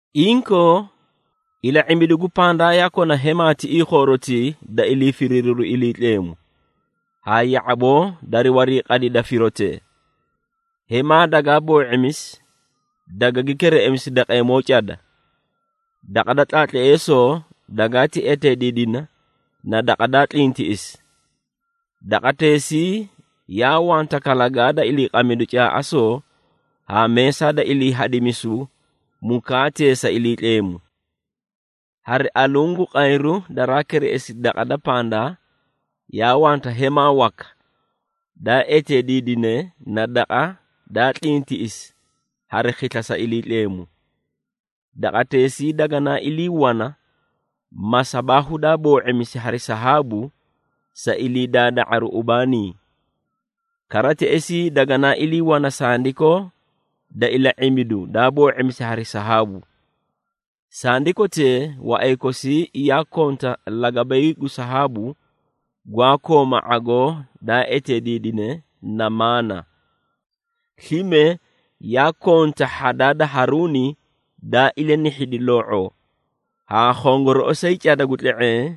Inkoo, ila⁄imbidu gu pandaa yaa kona hemaa tiꞌii khoorotii da ilii firiiriru Iliitleemu, haa ya⁄aboo dari wariiqadida firotee. Hemaa dagaa boo⁄imisi, dagagi kereꞌemisi daqeemoo cada. Daqa da tlaatleesoo dagaati eteediidina na Daqa daa Tlintiꞌisi. Daqateesii yaa wanta kalagaa da iliiqamidu caaꞌasoo haa meesaa da ilii hadimisu mukaatee sa Iliitleemu. Hari aluũ gu qayru daraa kereꞌesi daqa da pandaa, yaa wanta hemaa waka daa eteediidine na Daqa daa Tlintiꞌisi Hari Khisla sa Iliitleemu. Daqateesii daganaa ilii wana masabaahu daa boo⁄imisi hari sahaabu sa ilii daada⁄aru ubaanii. Kara, teꞌesii daganaa ilii wana sandikoo da ila⁄imbidu daa boo⁄imisi hari sahaabu. Sandikotee waꞌay kosii yaa konta lagabay gu sahaabu, gwaa kooma ⁄agoo daa eteediidine na maana. Slime yaa konta, hhadaa da Haruuni daa ilanihhidi loo⁄oo, haa khongorooꞌosay cada gu tle⁄eẽ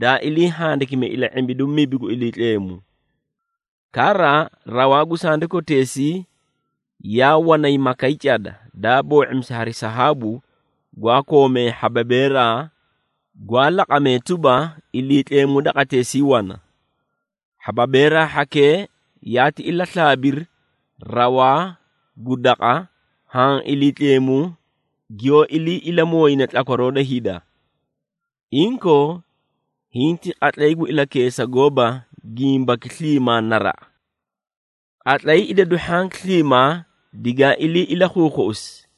daa ilii handikimi ila⁄imbidu mibi gu Iliitleemu. Kara, rawaa gu sandikoteesii yaa wanay makay cada, daa boo⁄imisi hari sahaabu gwaa koomee hhababeeraa, gwaa laqamee tuba, Iliitleemu daqateesii wana. Hhababeeraa hhakee yaati ilaslaabiri rawaa gu daqa, haã Iliitleemu giyoó ilii ilamooyine tlakwaroo da hida. Inkoo, hiĩ ti qatlay gu ilakeesa gooba gimbaki sliimaa naraꞌa. Qatlay idadu hhanki sliimaa digaa ilii ilakhuukhuꞌusi,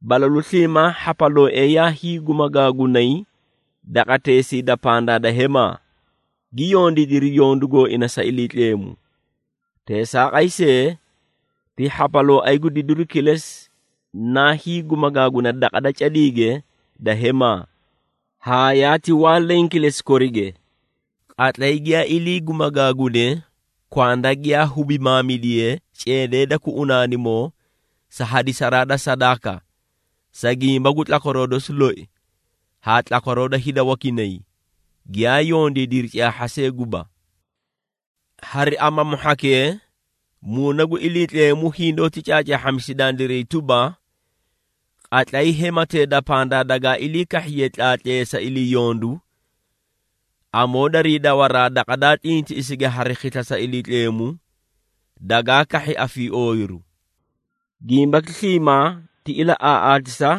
balalu sliimaa hhapalooee yaa hiigumagaagunay daqateesii da pandaa da hemaa, gi yondiidiri yondu gooina sa Iliitleemu. Teesaaqay see, ti hhapalooay gu didiru kilesi naa hiigumagaaguna daqa da cadiige da hemaa, haa yaati waa leẽ kilesi korige. Qatlay giyaa ilii gumagaagune kwanda giyaa hubimaamidiye ceedee da kuꞌunaanimoo sa hadisaraa da sadaaka, sa gimba gu tlakwaroo dosi loi haa tlakwaroo da hida wakinay, giyaa yondiidiri caahha see guba. Hari amamu hhakee, Muuna gu Iliitleemu hindoóti caacaahhamisi dandiray tuba, qatlay hematee da pandaa dagaa ilii kahhiye tlaatleesa ilii yondu, amoo darii dawaraa Daqa daa Tlintiꞌisige Hari Khisla sa Iliitleemu, dagaa kahhi afiiooyiru. Gimbaki sliimaa ti ilaꞌaaꞌaatisa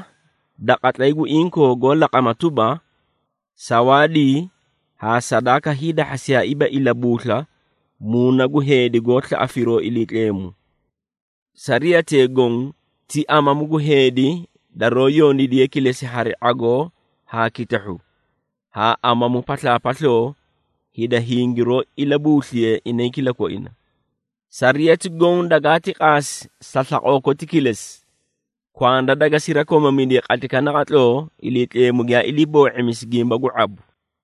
da qatlay gu inkoo goó laqama tuba, sawaadii haa sadaaka hiidahhasiyaaiiba ilabuusla muuna gu heedi goó slaꞌa firoo Iliitleemu. Sariyatee goõ ti amamu gu heedi daroó yondiidiye kilesi hari ⁄agoo haa kitahhu, haa amamu paslaapasloo hida hingiroó ilabuusliyee inay kilakoina. Sariyati goõ dagaati qaasi sa slaqoo koti kilesi, kwanda daga sirakomamidiye qatlaykaꞌa naqatloo Iliitleemu giyaa ilii boo⁄imisi gimba gu ⁄abu.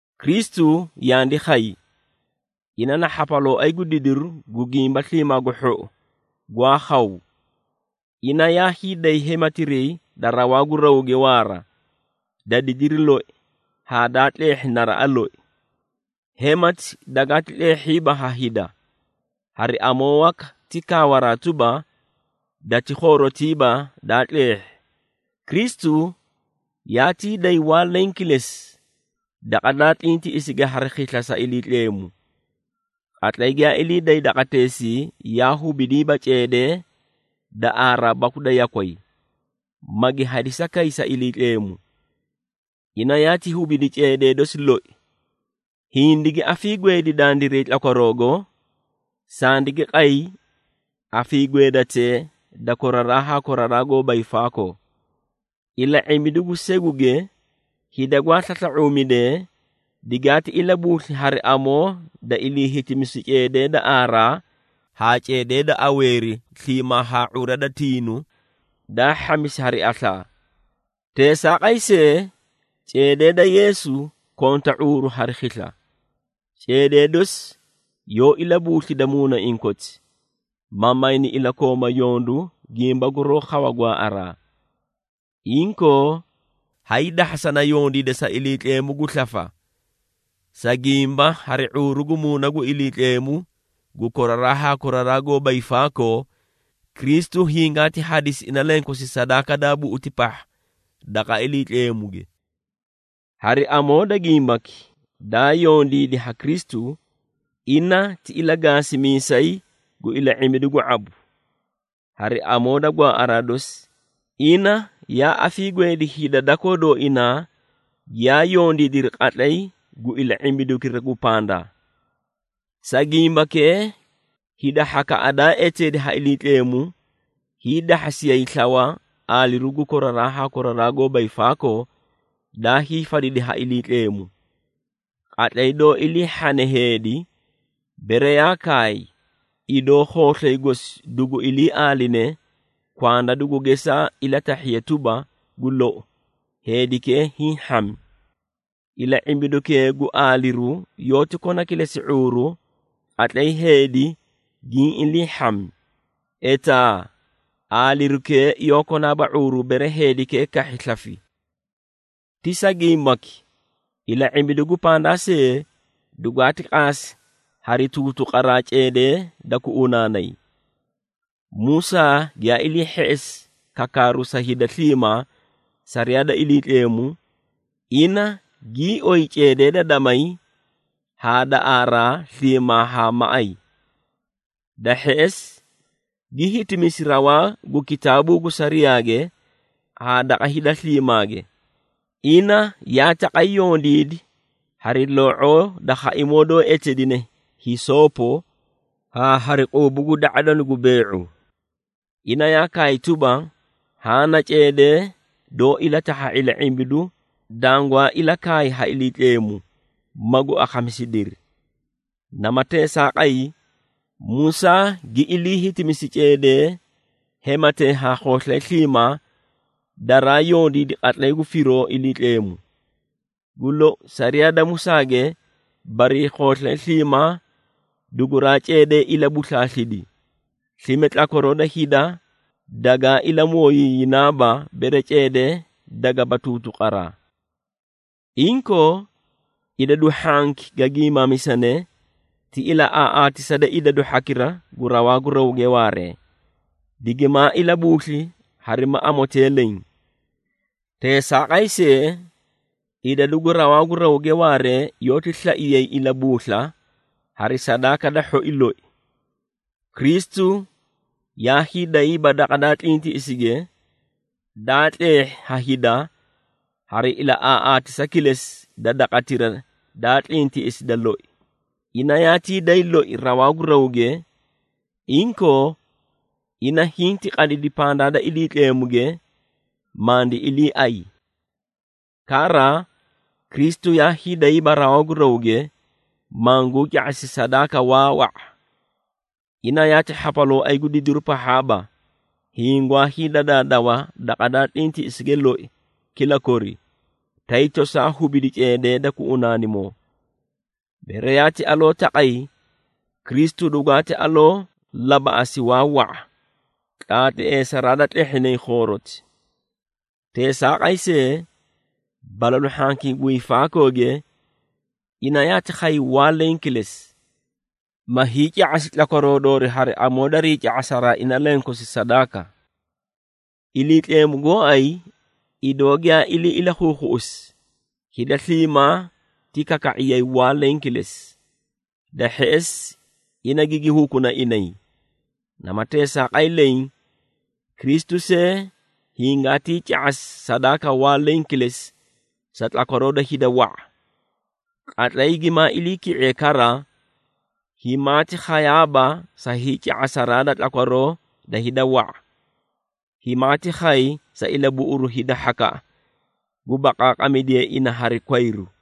Kristu yandi khay, ina na hhapalooay gu didiru gu gimba sliimaa gu hhou gwaa khaw. Ina yaa hiiday hematiray da rawaa gu rawge waara, da didiri loi haa daa tleehhi naraꞌa loi. Hemati dagaati tleehhiiba ha hida, hari amoo waka ti kaawaraa tuba, dati khoorotiiba daa tleehhi. Kristu yaatii day waa leẽ kilesi Daqa daa Tlintiꞌisige Hari Khisla sa Iliitleemu. Qatlay giyaa ilii day daqateesii yaa hubidiiba ceedee da aaraa baku da yakway, magi hadisa kay sa Iliitleemu. Ina yaati hubidi ceedee dosi loi, hindigi afiigweedi dandiray tlakwaroogo, sandigi qay afiigweedatee da koraraa haa koraraa goóba hiifaakoo. Ila⁄imbidu gu seguge, hida gwaa slasla⁄uumidee, digaati ilabuusli hari amoo da ilii hitimisu ceedee da aaraa haa ceedee da aweeri sliimaa haa ⁄ura da tiinu daa hhamisi hari aslaa. Teesaaqay see, ceedee da Yeesu konta ⁄uuru hari khisla! Ceedee dosi yoó ilabuuslida muunaiĩ koti, ma mayni ilakooma yondu gimba guroó khawa gwaaꞌaraa. Inkoo, hayii dahhasana yondiida sa Iliitleemu gu slafa, sa gimba hari ⁄uuru gu Muuna gu Iliitleemu gu koraraa haa koraraa goóba hiifaakoo, Kristu hingaati hadisi ina lenkosi sadaaka daa buꞌuti pahha daqa Iliitleemuge. Hari amoo da gimbaki daa yondiidi ha Kristu, ina ti ilagaasimiisay gu ila⁄imbidu gu ⁄abu. Hari amoo da gwaaꞌaraa dosi, ina yaa afiigweedi hida dakoo dooinaa giyaa yondiidiri qatlay gu ila⁄imbidukira gu pandaa. Sa gimbakee, hida hhakaꞌa daa eteedi ha Iliitleemu, hiidahhasiyay slawa aaliru gu koraraa haa koraraa goóba hiifaakoo daa hiifadidi ha Iliitleemu. Qatlay doó ilii hhane heedi, bere yaa kaay, idoo khooslay gosi dugu ilii aaline, kwanda dugu geesaa ilatahhiye tuba, gu lou heedikee hiĩ hhami. Ila⁄imbidukee gu aaliru yoóti kona kilesi ⁄uuru qatlay heedi giĩ ilii hhami, etaa aalirukee yoó konaaba ⁄uuru bere heedikee kahhi slafi. Ti sa gimbaki, ila⁄imbidu gu pandaa see dugwaati qaasi hari tuutuqaraa ceedee da kuꞌunaanay. Musaa giyaa ilii hheꞌesi kakaaru sa hida sliimaa sariyaa da Iliitleemu, ina gii oyi ceedee da damay haa da aaraa sliimaa haa maꞌay. Da hheꞌesi, gi hitimisi rawaa gu kitaabuu gu sariyaage haa daqa hida sliimaage. Ina yaa taqay yondiidi hari loo⁄oo da khaimoo doó eteedine hisoopo haa hari quubu gu da⁄adanu gu bee⁄u. Ina yaa kaay tuba, “Haã na ceedee doó ilatahha ila⁄imbidu dangwaa ilakaay ha Iliitleemu, magu akhamisidiri.” Nama teesaaqay, Musaa gi ilii hitimisi ceedee hematee haa khooslay sliimaa daraa yondiidi qatlay gu firoo Iliitleemu. Gu lou, sariyaa da Musaage barii khooslay sliimaa duguraa ceedee ilabuslaaslidi, slime tlakwaroo da hida dagaa ilamooyiiyinaaba bere ceedee dagaba tuutuqaraa. Inkoo, idadu hhanki ga giimaamisane ti ilaꞌaaꞌaatisa da idadu hhakira gu rawaa gu rawge waaree, digimaa ilabuusli harima amotee leẽ. Teesaaqay see, idadu gu rawaa gu rawge waaree, yoóti slaiyay ilabuusla hari sadaaka da hhoi loi. Kristu yaa hiidayiiba Daqa daa Tlintiꞌisige, daa tleehhi ha hida hari ilaꞌaaꞌaatisa kilesi da Daqatira da Tlintiꞌisi da loi. Ina yaati day loi rawaa gu rawge, inkoo ina hinti qadidi pandaa da Iliitleemuge, mandi iliiay. Kara, Kristu yaa hiidayiiba rawaa gu rawge, manguu ca⁄asi sadaaka waa wa⁄a. Ina yaati Hhapalooay gu didiru pahhaaba, hiĩ gwaa hiidadaadaw Daqa daa Tlintiꞌisige loi kila kori, tay tosaa hubidi ceedee da kuꞌunaanimoo. Bere yaati aloo taqay, Kristu dugwaati aloo labaꞌasi waa wa⁄a tlaatleesaraa da tlehhinay khooroti. Teesaaqay see, balalu hhankii gu hiifaakooge ina yaati khay waa leẽ kilesi, ma hiica⁄asi tlakwaroo doori hari amoo darii ca⁄asaraa ina lenkosi sadaaka. Iliitleemu gooay, idoo giyaa ilii ilakhuukhuꞌusi, hida sliimaa ti kaka⁄iyay waa leẽ kilesi, da hheꞌesi ina gigi hukuna inay. Nama teesaaqay leẽ, Kristu see hingaatii ca⁄asi sadaaka waa leẽ kilesi sa tlakwaroo da hida wa⁄a. Qatlay gimaa iliiki⁄iye kara, himaati khayaaba sa hiica⁄asa da tlakwaroo da hida wa⁄a, himaati khay sa ilabuꞌuru hida hhakaꞌa gu baqaaqamidiye ina hari kwayru.